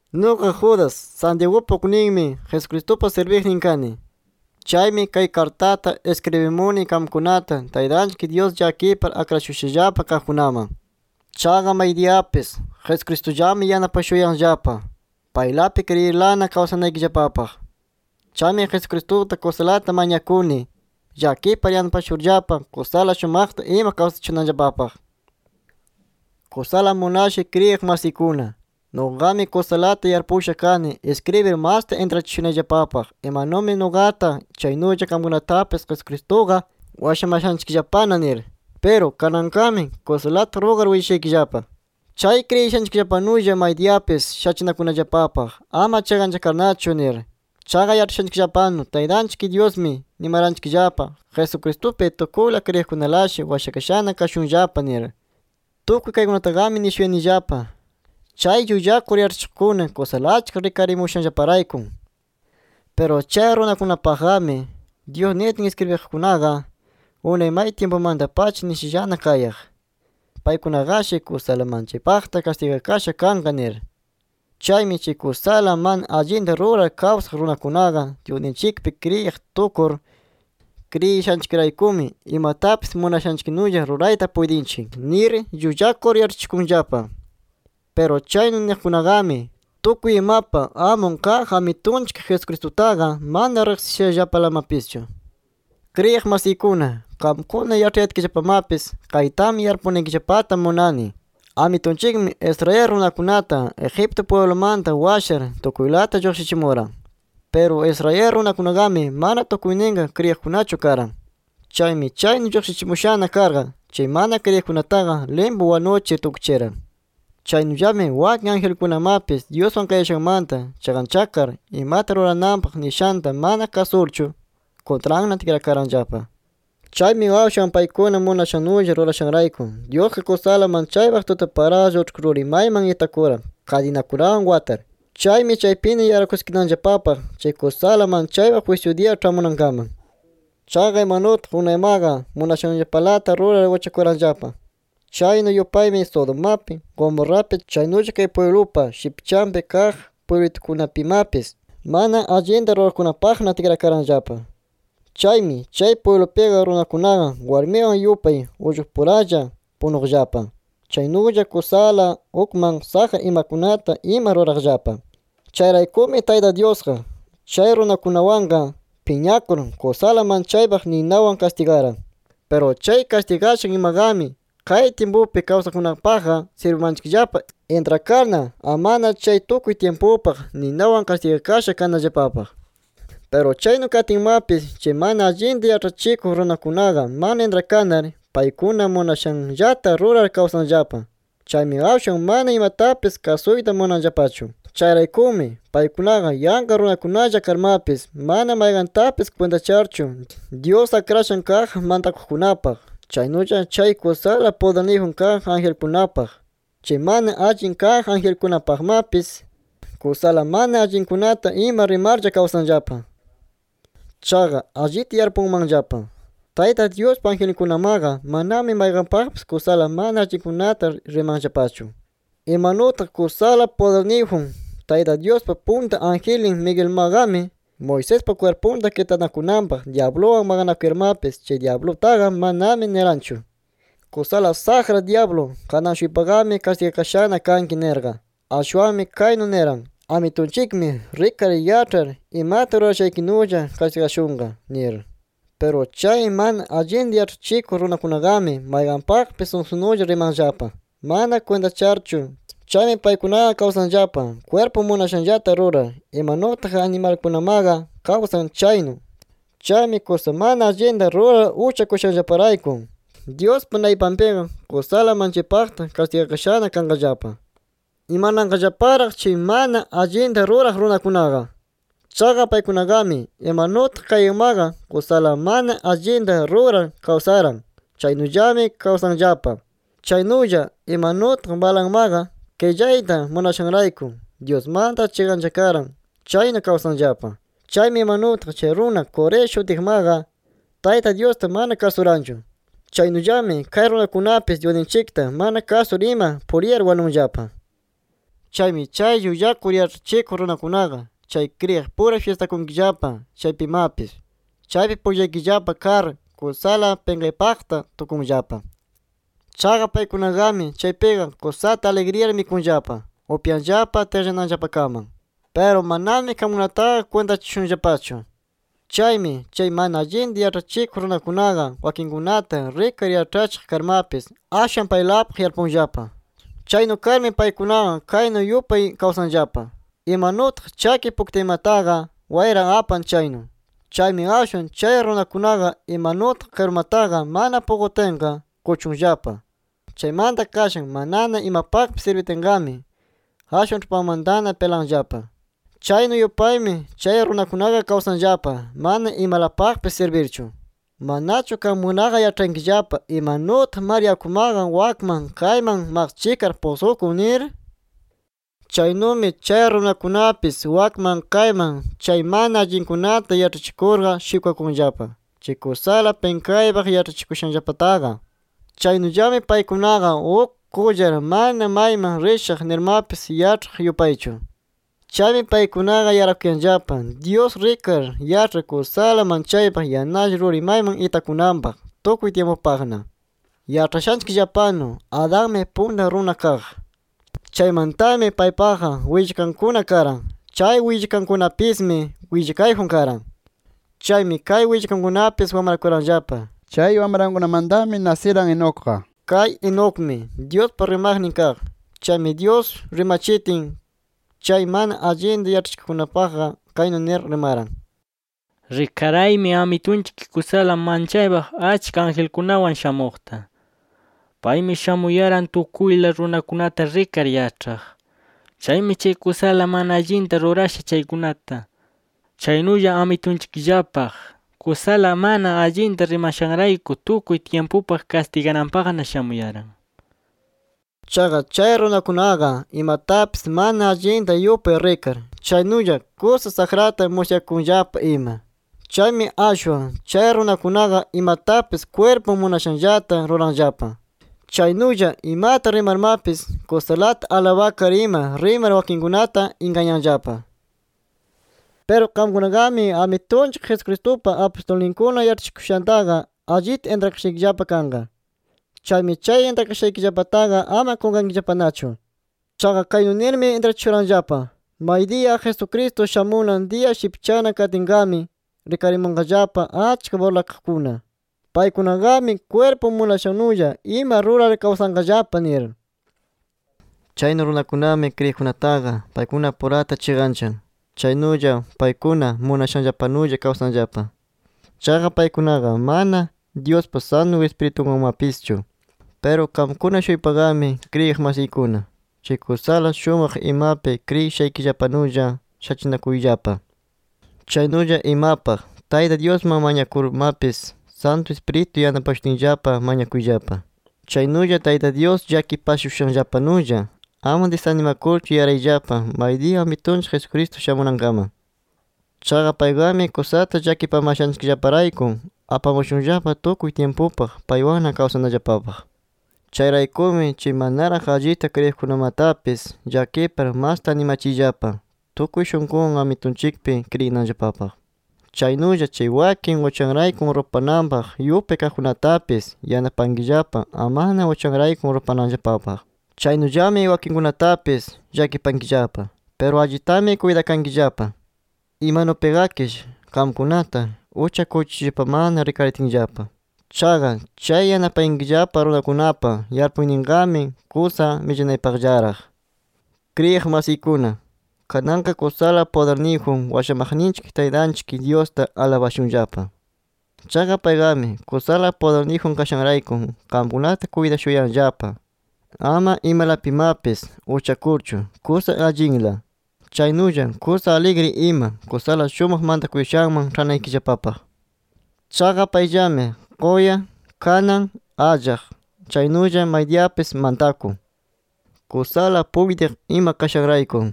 Nuqa Judas Santiagupa ukninmi, Jesucristupa sirbiqnin kani. Chaymi, kay kartata iskribimuni qamkunata Taytanchik Dyus llakipar akrashushallapa kaqkunaman. Chaqa maydiyapis Jesucristullami yanapashuyanllapa, paylapi kriyirlana kawsanaykillapapaq. Chaymi Jesucristuta kusalata mañakuni llakipar yanapashurllapa, kusala shumaqta ima kawsachishunanllapapaq. Kusala munashay kriyiq masiykuna, nuqami kusalata yarpusha kani iskribir masta intrachishunayllapapaq imanumi nuqata, chaynulla qamkunatapis Jesucristuqa washamashanchikllapana nir. Piru kananqami kusalata rugar willashaykillapa, chay kriyishanchikllapanulla maydiyapis shachinakunallapapaq ama chiqanchakarnachu nir. Chaqa yaĉhashanchikllapanu Taytanchik Dyusmi nimaranchikllapa Jesucristupi tukuyla kriyiqkunalashi washakashana kashunllapa nir. Tukuy kaykunataqami nishuyanillapa, chay llullakur yaĉhachikuqkuna kusala achka rikarimushanllaparayku. Piru chay runakunapaqqami, Dyus nitin iskribiqkunaqa unay may tyimpumanta-pacha nishallana kayaq, paykunaqashi kusala manchaypaqta kastigakasha kanqa nir. Chaymi chay kusala mana allinta rurar kawsaq runakunaqa Dyusninchikpi kriyiq tukur, “Kriyishanchikraykumi, imatapis munashanchiknulla rurayta puytinchik” nir llullakur yaĉhachikunllapa. Piru chaynu niqkunaqami, tukuy imapa amun kaq Amitunchik Jesucristutaqa, mana riqsishallapalamapischu. Kriyiq masiykuna, qamkuna yaĉhayatkillapamapis, kaytami yarpunaykillapata munani: Amitunchikmi Israel runakunata Egipto pwiblumanta washar tukuylata lluqshichimuran. Piru Israel runakunaqami, mana tukuyninqa kriyiqkunachu karan. Chaymi chaynu lluqshichimushana karqa, chay mana kriyiqkunataqa limpu wanuchir tukchiran. Chaynullami wakin angelkunamapis Dyuswan kayashanmanta chiqanchakar, imata rurananpaq nishanta mana kasurchu, kuntranna tikrakaranllapa. Chaymi ashwan paykuna munashannulla rurashanrayku, Dyusqa kusala manchaypaq tutaparaqlla uĉhku ruri mayman itakuran kadinakunawan watar. Chaymi chaypina yarakuskinanllapapaq chay kusala manchaypaq jwisyu diya ĉhamunankaman. Chaqa imanutaq unaymaqa munashanllapalata rurar uchakuranllapa, chaynu yupaymi Sodomapi, Gomorrapi, chaynulla kay pwiblupa shipchanpi kaq pwiblitukunapimapis mana allinta ruraqkunapaqna tikrakaranllapa. Chaymi chay pwiblupiqa runakunaqa warmiwan yupay ullqupuralla punuqllapa. Chaynulla kusala ukman saqra imakunata ima ruraqllapa. Chayraykumi Tayta Dyusqa chay runakunawanqa piñakur, kusala manchaypaq ninawan kastigaran. Piru chay kastigashan imaqami kay tyimpupi kawsaqkunapaqqa sirbimanchikllapa, intrakarna amana chay tukuy tyimpupaq ninawan kastigakasha kanallapapaq. Piru chaynu katinmapis chay mana allinta yaĉhachikuq runakunaqa mana intrakanar, paykuna munashanllata rurar kawsanllapa. Chaymi ashwan mana imatapis kasuyta munanllapachu. Chayraykumi, paykunaqa yanqa runakunalla karmapis mana mayqantapis kwintacharchu, Dyus akrashan kaq mantakuqkunapaq, chaynulla chay kusala pudirniyjun kaq angelkunapaq, chay mana allin kaq angelkunapaqmapis, kusala mana allinkunata ima rimarlla kawsanllapa. Chaqa allita yarpunmanllapa, Tayta Dyuspa angelninkunamaqa manami mayqanpaqpis kusala mana allinkunata rimanllapachu. Imanutaq kusala pudirniyjun Tayta Dyuspa punta angelnin Miguelmaqami, Moisespa kwirpunta kitanakunanpaq dyabluwan maqanakuyarmapis chay dyablutaqa manami niranchu: “Kusala saqra dyablu, kanan-shuypaqami kastigakashana kanki” nirqa. Ashwanmi kaynu niran: “Amitunchikmi rikar yaĉhar imata rurashaykinulla kastigashunqa” nir. Piru chay mana allinta yaĉhachikuq runakunaqami, mayqanpaqpis sunsunulla rimanllapa, mana kwintacharchu. Chaymi paykunaqa kawsanllapa kwirpun munashanllata rurar, imanutaq animalkunamaqa kawsan chaynu. Chaymi kusa mana allinta rurar uchakushanllaparayku Dyuspa naypanpiqa kusala manchaypaqta kastigakashana kanqallapa. ¡Imananqallaparaq chay mana allinta ruraq runakunaqa! Chaqa paykunaqami, imanutaq Cainmaqa kusala mana allinta rurar kawsaran, chaynullami kawsanllapa. Chaynulla imanutaq Balaammaqa qillayta munashanrayku Dyusmanta chiqanchakaran chaynu kawsanllapa. Chaymi imanutaq chay runa Coré shutiqmaqa Tayta Dyusta mana kasuranchu, chaynullami kay runakunapis Dyusninchikta mana kasur ima puriyar wanunllapa. Chaymi chay llullakur yaĉhachikuq runakunaqa chay kriyiqpura fyistakunkillapa chaypimapis, chaypi pullaykillapa kar, kusala pinqaypaqta tukunllapa. Chaqa paykunaqami chaypiqa kusata aligriyar mikunllapa, upyanllapa tiqllananllapakaman. Piru manami qamkunataqa kwintachashunllapachu. Chaymi chay mana allinta yaĉhachikuq runakunaqa, wakinkunata rikar yaĉhachiq karmapis, ashwan paylapaq yarpunllapa. Chaynu karmi paykunaqa kaynu yupay kawsanllapa: Imanutaq chaki puktaymataqa wayra apan chaynu. Chaymi ashwan chay runakunaqa, imanutaq qirumataqa mana puqutinqa, kuchunllapa. Chaymanta qashan manana imapaqpis sirbitinqami, ashwan ĉhupanmantana pilanllapa, chaynu yupaymi chay runakunaqa kawsanllapa mana imalapaqpis sirbirchu. ¿Manachu qamkunaqa yaĉhankillapa imanutaq mar yakumaqa wakman kayman maqchikar pusqukun nir? Chaynumi chay runakunapis wakman kayman chay mana allinkunata yaĉhachikurqa shikwakunllapa, chay kusala pinqaypaq yaĉhachikuyashanllapataqa. Chaynullami paykunaqa uk qullar, mana mayman rishaq nirmapis yaĉhaq yupaychu. Chaymi paykunaqa yarakuyanllapa Dyus rikar yaĉhar kusala manchaypaq yanalla ruri mayman itakunanpaq tukuy tyimpupaqna. Yaĉhashanchikllapanu Adanmi punta runa kaq. Chaymantami paypaqa willkankuna karan. Chay willkankunapismi willkayjun karan. Chaymi kay willkankunapis wamrakuranllapa. Chay wamrankunamantami nasiran Enocqa. Kay Enocmi Dyuspa rimaqnin kaq. Chaymi Dyus rimachitin, chay mana allinta yaĉhachikuqkunapaqqa kaynu nir rimaran: “Rikaraymi Amitunchik kusala manchaypaq achka angelkunawan shamuqta. Paymi shamuyaran tukuyla runakunata rikar yaĉhaq. Chaymi chay kusala mana allinta rurasha chaykunata, chaynulla Amitunchikllapaq kusala mana allinta rimashanrayku tukuy tyimpupaq kastigananpaqna shamuyaran” nir. Chaqa chay runakunaqa imatapis mana allinta yupay rikar, chaynulla kusa saqrata musyakunllapa ima. Chaymi ashwan chay runakunaqa imatapis kwirpun munashanllata ruranllapa. Chaynulla imata rimarmapis kusalata alabakar ima rimar wakinkunata ingañanllapa. Piru qamkunaqami Amitunchik Jesucristupa apustulninkuna yaĉhachikushantaqa allita intrakashaykillapa kanqa. Chaymi chay intrakashaykillapataqa ama qunqankillapanachu. Chaqa kaynu nirmi intrachishuranllapa: “Maydiya Jesucristo shamunan diya shipchana katinqami, rikarimunqallapa achka burlakaqkuna. Paykunaqami kwirpun munashannulla ima rurar kawsanqallapa” nir. Chaynu runakunami kriyiqkunataqa paykunapurata chiqanchan. Chaynulla paykuna munashanllapanulla kawsanllapa. Chaqa paykunaqa mana Dyuspa Santu Ispiritunwanmapischu. Piru qamkuna-shuypaqami kriyiq masiykuna, chay kusala shumaq imapi kriyishaykillapanulla shachinakuyllapa, chaynulla imapaq Tayta Dyusman mañakunarmapis Santu Ispiritu yanapashutinllapa mañakuyllapa. Chaynulla Tayta Dyus llakipashushanllapanulla ama disanimakurchu yarayllapa maydiya Amitunchik Jesucristo shamunankaman. Chaqa payqami kusata llakipamashanchikllaparayku apamashunllapa tukuy tyimpupaq paywanna kawsanallapapaq. Chayraykumi chay manaraq allita kriyiqkunamatapis llakipar masta animachiyllapa tukuy shunqunwan Amitunchikpi kriyinanllapapaq. Chaynulla chay wakin uchanrayku rupananpaq yupay kaqkunatapis, yanapankillapa amana uchanrayku rupananllapapaq. Chaynullami wakinkunatapis llakipankillapa. Piru allitami kuytakankillapa. Imanupiqakish qamkunata uchakuchishushallapamana rikaritinllapa. Chaqa chay yanapayankillapa runakunapa yarpuyninqami, kusa millanaypaqllaraq. Kriyiq masiykuna, kananqa kusala pudirniyjun washamaqninchik Taytanchik Dyusta alabashunllapa. Chaqa payqami kusala pudirniyjun kashanrayku qamkunata kuytashuyanllapa ama imalapimapis uchakurchu kusa allinla, chaynulla kusa aligri ima kusala shumaq mantakuyashanman ĉhanaykillapapaq. Chaqa payllami, quya, kanan, allaq, chaynulla maydiyapis mantakun, kusala puytiq ima kashanrayku.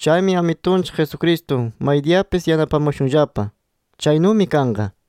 Chaymi Amitunchik Jesucristo maydiyapis yanapamashunllapa. Chaynumi kanqa.